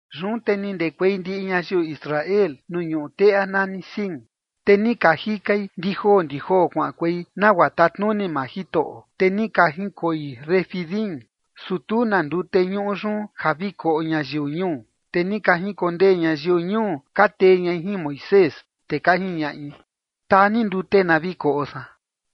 Yun te ni ndekuei ndiꞌi ñayiu Israel nuu ñuꞌu teꞌa nani Sin, te ni ka jikai ndijoo ndijoo kuaꞌankuei, nagua tatnuni maa Jitoꞌo, te ni ka jinkoi Refidim, su tu na ndute ñuꞌu yun ja vi koꞌo ñayiu ñuu. Te ni ka jinkondee ñayiu ñuu ka tee ñai jin Moisés, te ka jiñaꞌi: ―Taa ni ndute na vi koꞌo san.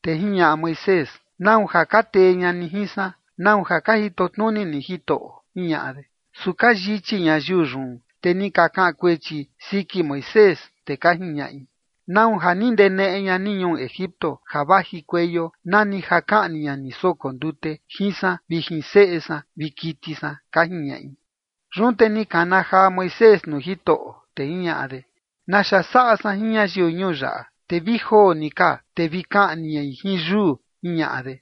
Te jiñaꞌa Moisés: ―¿Nau ja ka tee ña ni jin san? ¿Nau ja ka jito tnuni ni Jitoꞌo? ―jiñaꞌa de. Su ka yichi ñayiu yun, te ni ka kaꞌan kuechi siki Moisés, te ka jiñaꞌi: ―¿Nau ja ni ndeneꞌe ña ni ñuu Egipto ja vajikueio nani ja kaꞌni ña ni soko ndute jin san vi jin seꞌe san vi kiti san? ―ka jiñaꞌi. Yun te ni kana jaa Moisés nuu Jitoꞌo, te jiñaꞌa de: ―¿Naxa saꞌa san jin ñayiu ñuu yaꞌa? Te vi joo ni ka te vi kaꞌni ñai jin yuu ―jiñaꞌa de.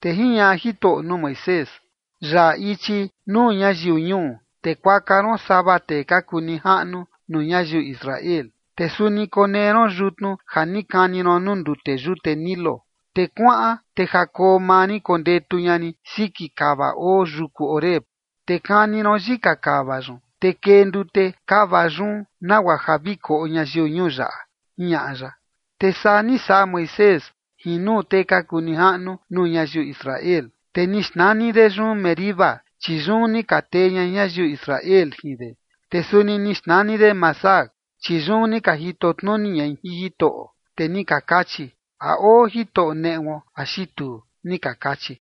Te jiñaꞌa Jitoꞌo nuu Moisés: ―Yaꞌa ichi nuu ñayiu ñuu, te kuaka ron sava tee ka kuu nijaꞌnu nuu ñayiu Israel, te suni konee ron yutnu ja ni kani ron nuu ndute yute Nilo, te kuaꞌan. Te ja koo maa rin kondetu ña rin siki kava oo yuku Horeb, te kani ron yika kava yun, te kee ndute kava yun, nagua ja vi koꞌo ñayiu ñuu yaꞌa ―jiñaꞌa ya. Te saa ni saꞌa Moisés jin nuu tee ka kuu nijaꞌnu nuu ñayiu Israel. Te ni xnani de yun Meriba, chi yun ni ka tee ña ñayiu Israel jin de. Te suni ni xnani de Masah, chi yun ni ka jito tnuni ñai jin Jitoꞌo, te ni ka kachi: “¿A oo Jitoꞌo neꞌuo axi tuu?”, ni ka kachi.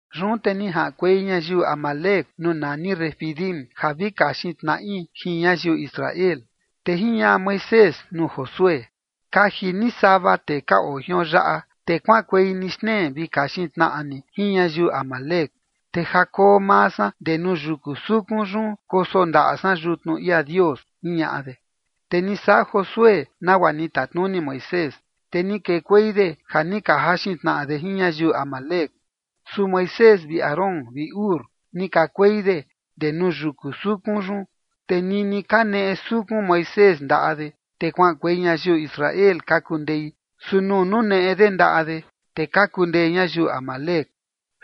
Yun te ni jaꞌankuei ñayiu amalec nuu nani Refidim ja vi kaxin tnaꞌi jin ñayiu Israel. Te jiñaꞌa Moisés nuu Josué: ―Kaji ni sava tee ka oo jion yaꞌa, te kuaꞌankuei ni xtnee vi kaxin tnaꞌa ni jin ñayiu amalec. Te ja koo maa san ndee nuu yuku sukun yun, koso ndaꞌa san yutnu ia Dios ―jiñaꞌa de. Te ni saꞌa Josué nagua ni tatnuni Moisés, te ni kekuei de ja ni ka jaxin tnaꞌa de jin ñayiu amalec, su Moisés vi Aarón vi Hur ni kakuei de ndee nuu yuku sukun yun. Te nini kaneꞌe sukun Moisés ndaꞌa de, te kuaꞌankuei ñayiu Israel ka kundei, su nuu nuneꞌe de ndaꞌa de, te ka kundee ñayiu amalec.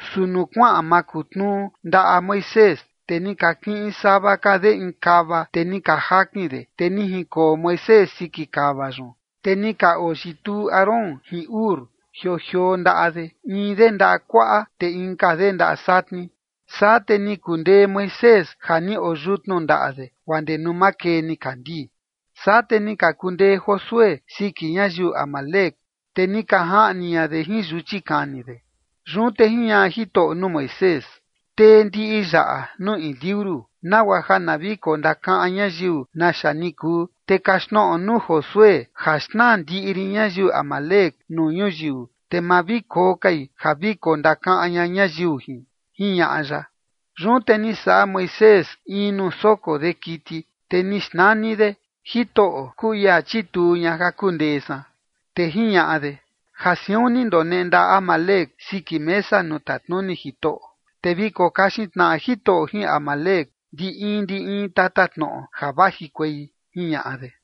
Su nuu kuaꞌan makutnuu ndaꞌa Moisés, te ni ka kiꞌin sava ka de in kava, te ni ka jakin de, te ni jinkoo Moisés siki kava yun. Te ni ka oyituu Aarón jin Hur jioo jioo ndaꞌa de, in de ndaꞌa kuaꞌa, te inka de ndaꞌa satni. Saa te ni kundee Moisés ja ni oyutnu ndaꞌa de guaa ndee nuu makee nikandii. Saa te ni ka kundee Josué siki ñayiu amalec, te ni ka jaꞌni ña de jin yuchi kani de. Yun te jiñaꞌa Jitoꞌo nuu Moisés: ―Tee ndiꞌi yaꞌa nuu in liuru, nagua ja na vi kondakaꞌan ñayiu naxa ni kuu, te kaxtnoꞌo nuu Josué ja xnaa ndiꞌi rin ñayiu amalec nuu ñuyiu, te ma vi koo kai ja vi kondakaꞌan ña ñayiu jin ―jiñaꞌa ya. Yun te ni saꞌa Moisés in nuu soko de kiti, te ni xnani de “Jitoꞌo kuu ia chituu ña ja kundee san”. Te jiñaꞌa de: ―Ja siun ni ndoneꞌe ndaꞌa Amalec siki mesa nuu tatnuni Jitoꞌo, te vi kokaxin tnaꞌa Jitoꞌo jin Amalec ndi in ndi in tatatnoꞌo ja vajikuei ―jiñaꞌa de.